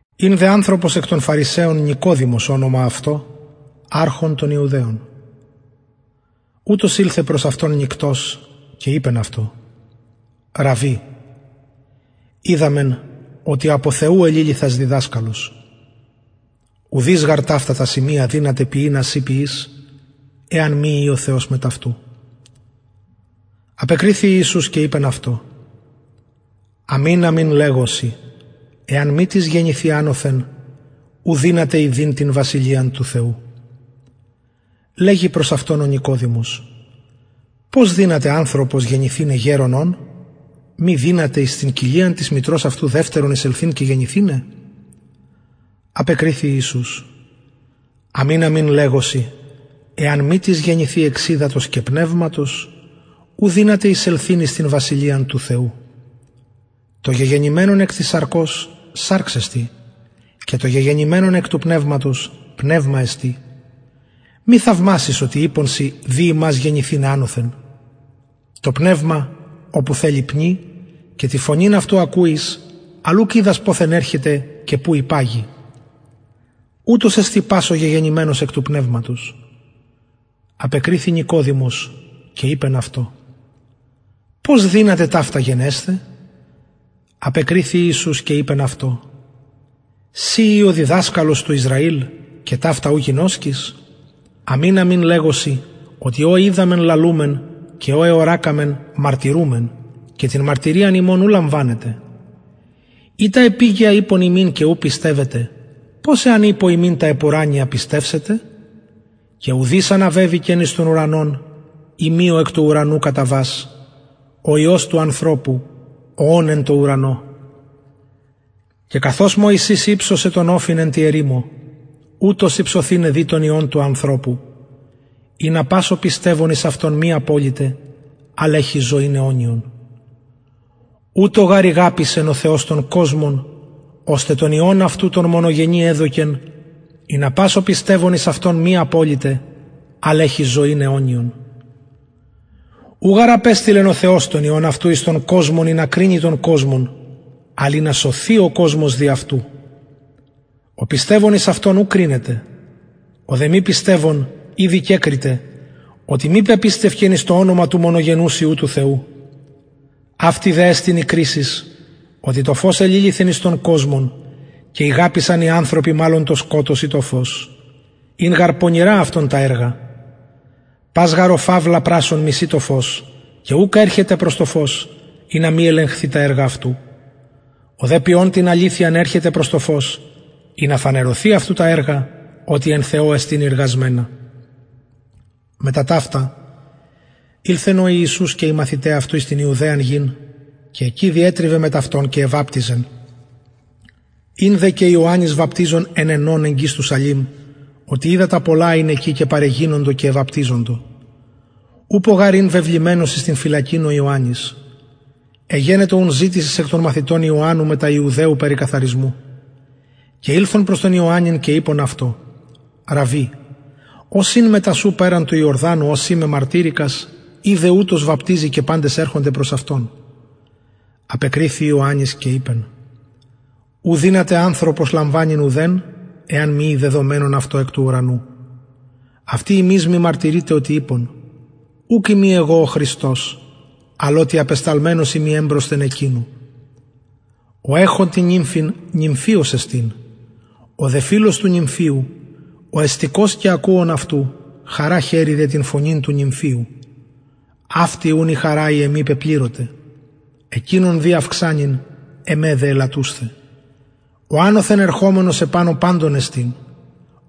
ην δε ανθρωπος εκ των φαρισαιων νικοδημος ονομα αυτω αρχων των ιουδαιων ουτος ηλθεν προς αυτον νυκτος και ειπεν αυτω ραββι οιδαμεν οτι απο θεου εληλυθας διδασκαλος ουδεις γαρ ταυτα τα σημεια δυναται ποιειν α συ ποιεις εαν μη η ο θεος μετ αυτου απεκριθη ο ιησους και ειπεν αυτω αμην αμην λεγω σοι εαν μη τις γεννηθη ανωθεν ου δυναται ιδειν την βασιλειαν του θεου λεγει προς αυτον ο νικοδημος πως δυναται ανθρωπος γεννηθηναι γερων ων μη δυναται εις την κοιλιαν της μητρος αυτου δευτερον εισελθειν και γεννηθηναι απεκριθη ιησους αμην αμην λεγω σοι εαν μη τις γεννηθη εξ υδατος και πνευματος ου δυναται εισελθειν εις την βασιλειαν του θεου το γεγεννημενον εκ της σαρκος σαρξ εστιν και το γεγεννημενον εκ του πνευματος πνευμα εστιν μη θαυμασης οτι ειπον σοι δει υμας γεννηθηναι ανωθεν το πνευμα οπου θελει πνει και την φωνην αυτου ακουεις αλλ ουκ οιδας ποθεν ερχεται και που υπαγει ουτως εστιν πας ο γεγεννημενος εκ του πνευματος απεκριθη νικοδημος και ειπεν αυτω πως δυναται ταυτα γενεσθαι απεκριθη ιησους και ειπεν αυτω συ ει ο διδασκαλος του ισραηλ και ταυτα ου γινωσκεις αμην αμην λεγω σοι οτι ο οιδαμεν λαλουμεν και ο εωρακαμεν μαρτυρουμεν και την μαρτυριαν ημων ου λαμβανετε ει τα επιγεια ειπον υμιν και ου πιστευετε πως εαν ειπω υμιν τα επουρανια πιστευσετε και ουδεις αναβεβηκεν εις τον ουρανον ει μη ο εκ του ουρανου καταβας ο υιος του ανθρωπου ο ων εν τω ουρανω και καθως μωσης υψωσεν τον οφιν εν τη ερημω ουτως υψωθηναι δει τον υιον του ανθρωπου ινα πας ο πιστευων εις αυτον μη αποληται αλλ εχη ζωην αιωνιον ουτως γαρ ηγαπησεν ο θεος τον κοσμον ωστε τον υιον αυτου τον μονογενη εδωκεν ινα πας ο πιστευων εις αυτον μη αποληται αλλ εχη ζωην αιωνιον ου γαρ απεστειλεν ο θεος τον υιον αυτου εις τον κοσμον ινα κρινη τον κοσμον αλλ ινα σωθη ο κοσμος δι αυτου ο πιστευων εις αυτον ου κρινεται ο δε μη πιστευων ηδη κεκριται οτι μη πεπιστευκεν εις το ονομα του μονογενους υιου του θεου αυτη δε εστιν η κρισις οτι το φως εληλυθεν εις τον κοσμον και ηγαπησαν οι ανθρωποι μαλλον το σκοτος η το φως ην γαρ πονηρα αυτων τα εργα πας γαρ ο φαυλα πρασσων μισει το φως και ουκ ερχεται προς το φως ινα μη ελεγχθη τα εργα αυτου ο δε ποιων την αληθειαν ερχεται προς το φως ινα φανερωθη αυτου τα εργα οτι εν θεω εστιν ειργασμενα μετα ταυτα ηλθεν ο ιησους και οι μαθηται αυτου εις την ιουδαιαν γην και εκει διετριβεν μετ αυτων και εβαπτιζεν ην δε και ιωαννης βαπτιζων εν αινων εγγυς του σαλημ οτι υδατα πολλα ην εκει και παρεγινοντο και εβαπτιζοντο ουπω γαρ ην βεβλημενος εις την φυλακην ο ιωαννης εγενετο ουν ζητησις εκ των μαθητων ιωαννου μετα ιουδαιου περι καθαρισμου και ηλθον προς τον ιωαννην και ειπον αυτω ραββι ος ην μετα σου περαν του ιορδανου ω συ μεμαρτυρηκας ιδε ουτος βαπτιζει και παντες ερχονται προς αυτον απεκριθη ιωαννης και ειπεν ου δυναται ανθρωπος λαμβανειν ουδεν εαν μη η δεδομενον αυτω εκ του ουρανου αυτοι υμεις μαρτυρειτε οτι ειπον ουκ ειμι εγω ο χριστος αλλ οτι απεσταλμενος ειμι εμπροσθεν εκεινου ο εχων την νυμφην νυμφιος εστιν ο δε φιλος του νυμφιου ο εστηκως και ακουων αυτου χαρα χαιρει δια την φωνην του νυμφιου αυτη ουν η χαρα η εμη πεπληρωται εκεινον δει αυξανειν εμε δε ελαττουσθαι ο ανωθεν ερχομενος επανω παντων εστιν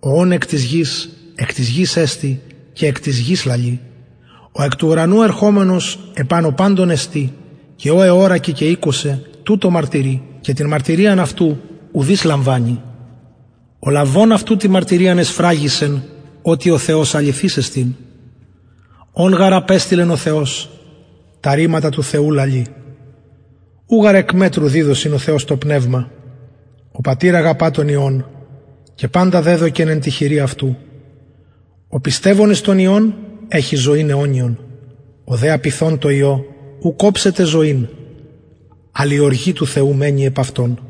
ο ων εκ της γης εκ της γης εστιν και εκ της γης λαλει ο εκ του ουρανου ερχομενος επανω παντων εστιν και ο εωρακεν και ηκουσεν τουτο μαρτυρει και την μαρτυριαν αυτου ουδεις λαμβανει ο λαβων αυτου την μαρτυριαν εσφραγισεν οτι ο θεος αληθης εστιν ον γαρ απεστειλεν ο θεος τα ρηματα του θεου λαλει ου γαρ εκ μετρου διδωσιν ο θεος το πνευμα ο πατηρ αγαπα τον υιον και παντα δεδωκεν εν τη χειρι αυτου ο πιστευων εις τον υιον εχει ζωην αιωνιον ο δε απειθων τω υιω ουκ οψεται ζωην αλλ η οργη του θεου μενει επ αυτον